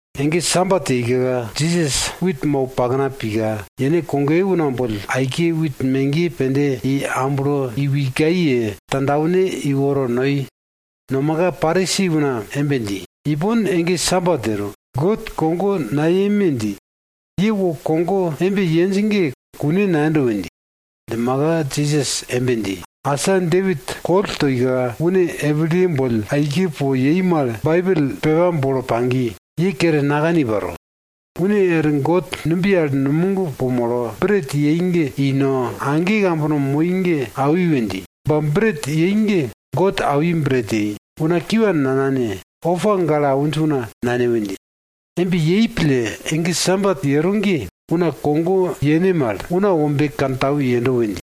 Ege Sabat yeika, Jisas wit mau pakna pika, yene kogoye una boll aike wit megiye pende i amblo i wikai ye tandwane iworo noi. Nomaka Parisi una embe dji, ipon ege Sabat yero, God kogo nayeme dji. Ye wo kogo embe yenj ge kune nayendo we dji. Djimaka Jisas embe dji, asa Depit koll toika une epiliye boll aike po yei mal Baibel pepa bolo pagi, ye kere nakani paro. Une er God numbiye al numog po molo bret yei ge i no, age kambono moi ge awi we dji. Ba bret yei ge God awi bret yei. Una kiwa nanane, opa gale awinj una nane we dji. Embe yei pille ege Sabat yero ge, una kogo yene mal Una Wombe kantau yendo we dji.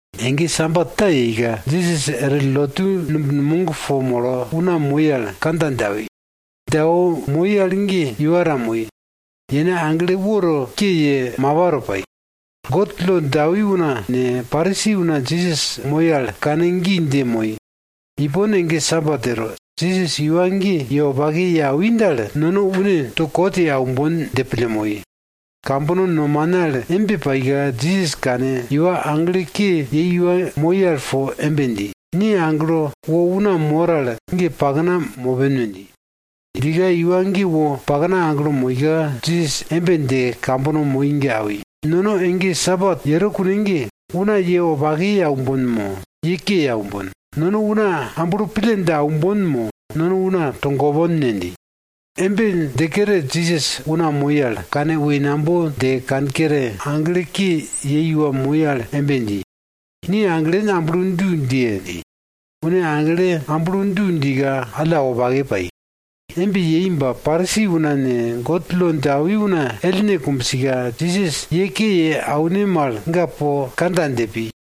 Ege Sabat ta yeika, Jisas er lotu numb numog po molo una moi al kandja dje awi. Dje awo moi al ge iwa ta moi. Yene agle woto ke ye, mapa to pai. God lo dje awi una ne, Parisi una Jisas moi al kane gi dje moi, ipon ge Sabat yero, Jisas iwa ge ye wopake ye awi dal, nono une to kot ye aumbon dje pille moi. Kambono nomane al embe paika, Jisas kane, iwa agle ke yei iwa moi al po embe dji, ni aglo wo una mor al ge pakna mopen we dji. Djika iwa ge wo pakna aglo moika, Jisas embe dje kambono moi ge awi, nono ege Sabat yero kune ge, una ye wopake ye aumbon mo, ye ke ye aumbon? Nono una amblo pille dje aumbon mo, nono una togopon ne? dji. Embe dje kere Jisas una moi al, kane woinambo dje kankere, agle ke yei iwa moi al embe dji, ni aglen amblo du djiye! dji. Une agle amblo du djika, alla wopake pai. Embe yei ba Parisi una ne, God lo dje awi una ellne kumbsika, Jisas ye ke ye aune mal ga po kandja dje pi.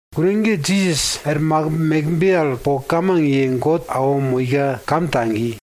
Kune ge Jisas er makimb mekbe al po kamang ye God awo moika kam tagi.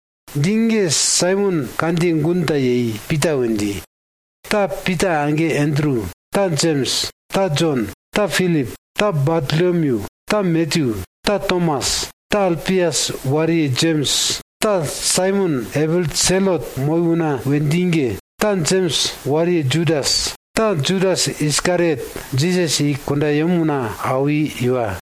Dji ge Saimon kandjiye gun ta yei Pita we dji. Ta Pita age Andru, ta Jems, ta Jon, ta Pilip, ta Bartolomyu, ta Matyu, ta Tomas, ta Alpias wariye Jems, ta Saimon epil Selot moi una we dji ge, ta Jems wariye Judas, ta Judas Iskariot Jisas i kundayem una awi iwa.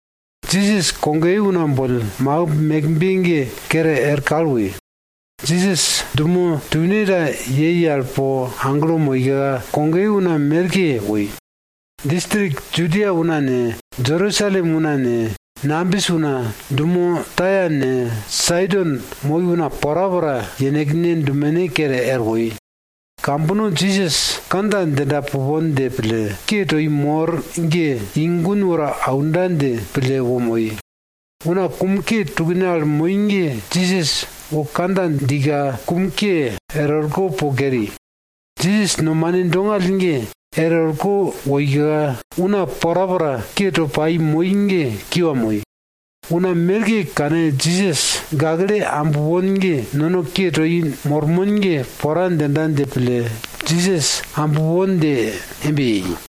Jisas kogoye una boll makimb mekbe ge kere er kal woi. Jisas dumo tune ta yei al po aglo moika, kogoye una merke woi. Distrik Judia una ne, Jerusalem una ne, nambis una, dumo Taia ne, Saidon moi una porapora yenekne dumene kere er woi. Kambono Jisas kandja djinda pupon dje pille, ke toi mor ge, i gun woro aunda dje pille wo moi. Una kum ke tukne al moi ge Jisas wo kandja djika, kum ke er orko po keri. Jisas nomane dongall ge er orko woika, una porapora ke to pai moi ge kiwa moi. Una merke kane Jisas gakle ambpon ge nono ke toi mormon ge pora djinda dje pille, Jisas ambpon dje embe yei.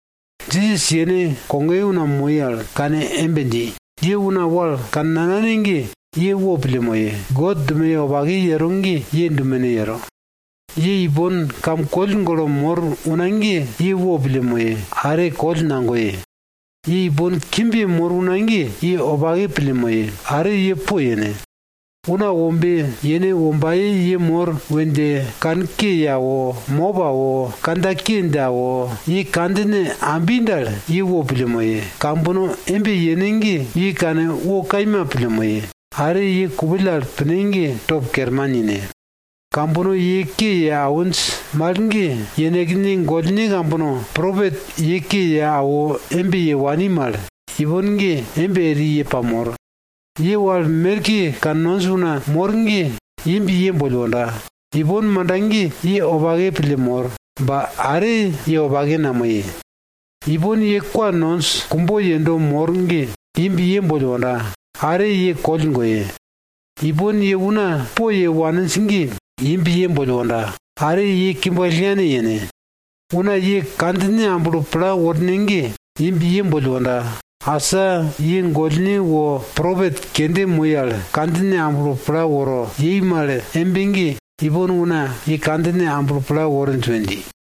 Jisas yene kogoye una moi al kane embe dji, ye una wal kannanane ge, ye wopille moye. God dumoye wopake yero ge ye dumene yero. Ye ipon kam koll golo mor una ge, ye wopille moye. Are koll nagoye. Ye ipon kimb yemor una ge, ye wopake pille moye. Are ye poyene. Una Wombe yene wombaye ye mor we dje kanke ye awo, mop awo, kandja ke dje awo, ye kandjine ambi dal, ye wopille moye. Kambono embe yene ge ye kane wo kaima pille moye. Are ye kupill al pine ge, top kerman ine. Kambono ye ke ye awinj mal ge, yenekne gollne kambono, propet ye ke ye awo embe ye wani mal, ipon ge embe eri ye pamor. Ye wal merke kannonj una mor ge, imb ye boll wonda! Ipon manda ge ye wopake pille mor, ba are ye wopake namoye. Ipon ye kwa nonj kumbo yendo mor ge, imb ye boll wonda! Are ye koll goye. Ipon ye una poye waninj ge, imb ye boll wonda! Are ye kimb kallngane yene. Una ye kandjine amblo pla worne ge, imb ye boll wonda! Asa ye gollne wo propet kende moi al kandjine amblo pla woro yei mal embe ge, ipon una ye kandjine amblo pla worinj we dji.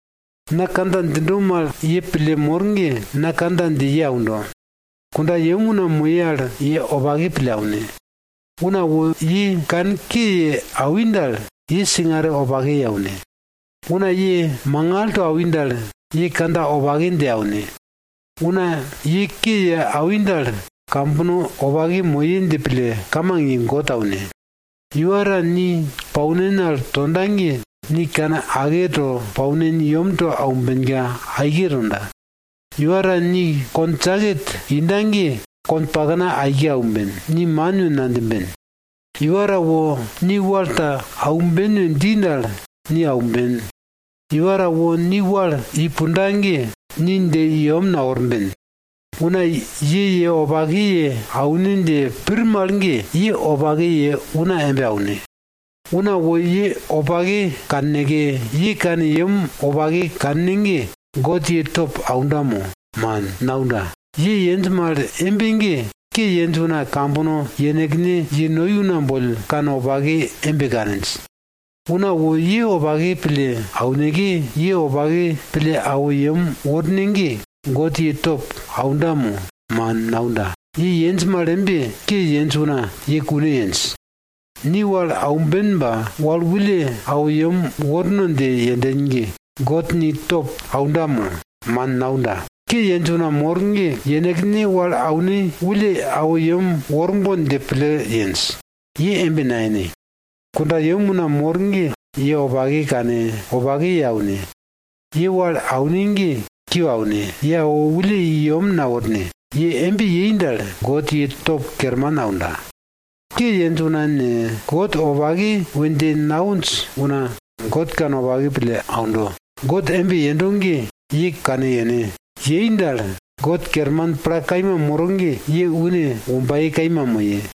Na kandja djindo mal ye pille mor ge, na kandja dje ye aundo. Kundayem una moye al, ye wopake pille aune. Una wo ye kanke ye awi dal, ye singare wopake ye aune. Una ye mangal to awi dal, ye kandja wopake dje aune. Una ye ke ye awi dal, kambono wopake moye dje pille kamang ye God aune. Iwa ta ni paunin al tonda ge, ni kane ake to paunin yemto aumbenka, aike tonda. Iwa ta ni kon jaket inda ge, konpakna aike aumben, ni man we nadjimben. Iwa ta wo, ni wal ta aumben we dji dal, ni aumben. Iwa ta wo ni wal i punda ge, ni dje i yem naworben. Una ye ye wopake ye aune dje pir mal ge, ye wopake ye una embe aune. Una wo ye wopake kanneke, ye kane yem wopake kanne ge, God ye top aunda mo? Ge man, naunda. Ye yenj mal embe ge, ke yenj una kambono yenekne ye noi una boll kanwopake embe kaninj. Una wo ye wopake pille auneke, ye wopake pille awo yem worne ge, God ye top aunda mo? Man, naunda. Ye yenj mal embe, ke yenj una ye kune yenj. Ni wal aumben ba, wal wulle awo yem worno dje yenden ge, God ni top aunda mo? Man, naunda. Ke yenj una mor ge yenekne wal aune wulle awo yem worbon dje pille yenj. Ye embe nayene. Kundayem una mor ge ye wopake kane, wopake ye aune. Ye wal aune ge, kiwa aune. Ye awo wulle i yem naworne. Ye embe yei dal, God ye top kerman aunda. Ke yenj una ne, God wopake we dje nawinj una, God kanwopake pille aundo. God embe yendo ge, ye kane yene. Yei dal, God kerman pla kaima moro ge, ye une wombaye kaima moye.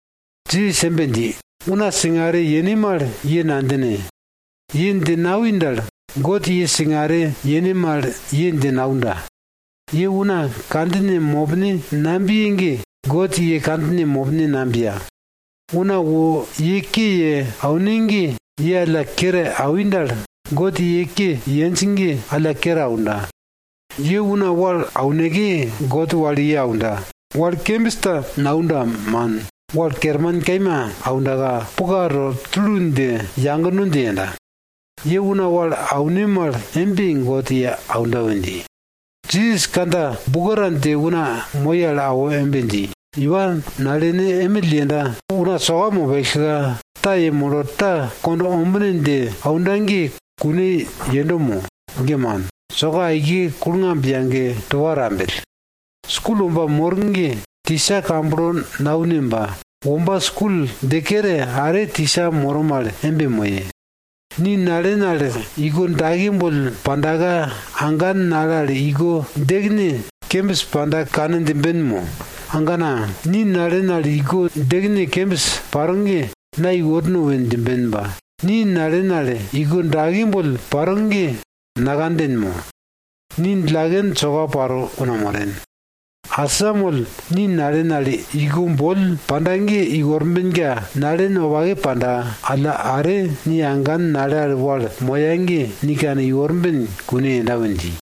Jisas embe dji, una singare yene mal ye nadjine. Ye dje nawi dal, God ye singare yene mal ye dje naunda. Ye una kandjine mopne nabiye ge, God ye kandjine mopne nabiya. Una wo ye ke ye aune ge, ye alla kere awi dal, God ye ke yenj ge alla kere aunda. Ye una wal auneke, God wal ye aunda. Wal kembis ta naunda man, wal kerman kaima aundaka, puka to tulu dje yagno dje yenda. Ye una wal aune mal embe God ye aunda we dji. Jisas kandja buko ta dje una moi al awo embe dji, iwa nalene emill yenda una soka mopellka, ta yemolo ta kond ombine dje aunda ge kune yendo mo? Ge man, soka aike kulngamb yage tupa tambell. Skul womba mor ge tisa kamblo naune ba, womba skul dje kere, are tisa moro mal embe moye. Ni nalen al iko dake boll pandaka, agan nale al iko djekene kembis panda kane djimben mo? Agana, ni nalen al iko djekene kembis paro ge, na iworno we djimben ba, ni nalen al iko dake boll paro ge nakanden mo? Ni djillaken soka paro una moren! Asamoll ni nalen al iko boll panda ge iworbenka, nalen wopake panda. Alla are ni agan nale al wal moya ge, ni kane iworben kune yenda we dji.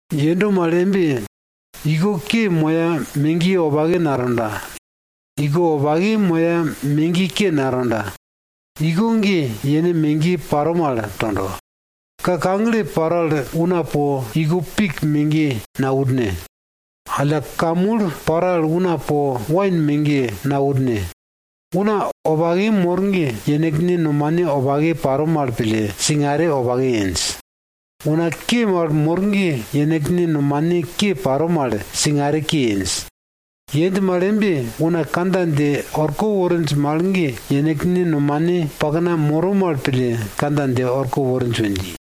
Yendo mal embe iko ke moya megiye wopake natonda. Iko wopake moya megiye ke natonda. Iko ge yene megiye paro mal tondo. Ka kagle paro al una po iko pik megiye naworne. Alla ka mul paro al una po wain megiye naworne. Una wopake mor ge, yenekne nomane wopake paro mal pille, singare wopake yenj. Una ke mal mor ge, yenekne nomane ke paro mal, singare ke yenj. Yenj mal embe, una kandja dje orko worinj mal ge, yenekne nomane pakna moro mal pille kandja dje orko worinj we dji.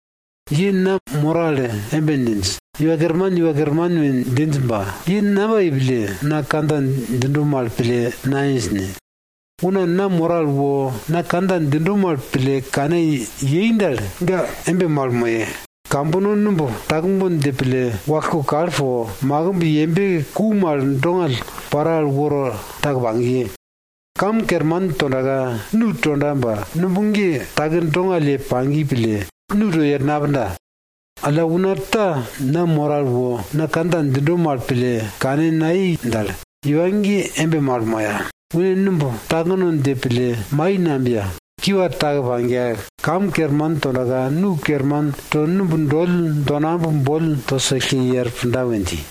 Ye na moro al embe djinj, Iwa Kerman, Iwa Kerman we djinj ba, ye namba yei pille na kandja djindo mal pille nayenj ne? Una na moro al wo, na kandja djindo mal pille kane yei dal, ga embe mal moye. Kambono numb takbon dje pille makimb wallko kal po, makimb yembe ku mal dongall paro al woro take pagiye. Kam kerman tondaka, nu tonda ba, numb ge take dongall ye pagiye pille, nu to i er napunda. Alla una ta na moro al wo na kandja djindo mal pille kane nayei dal, iwa ge embe mal moya. Une numb takno dje pille mai nabiya, kiwa take pagiya. Kam kerman tondaka nu kerman to numb doll donamb boll to sellke i er punda we dji.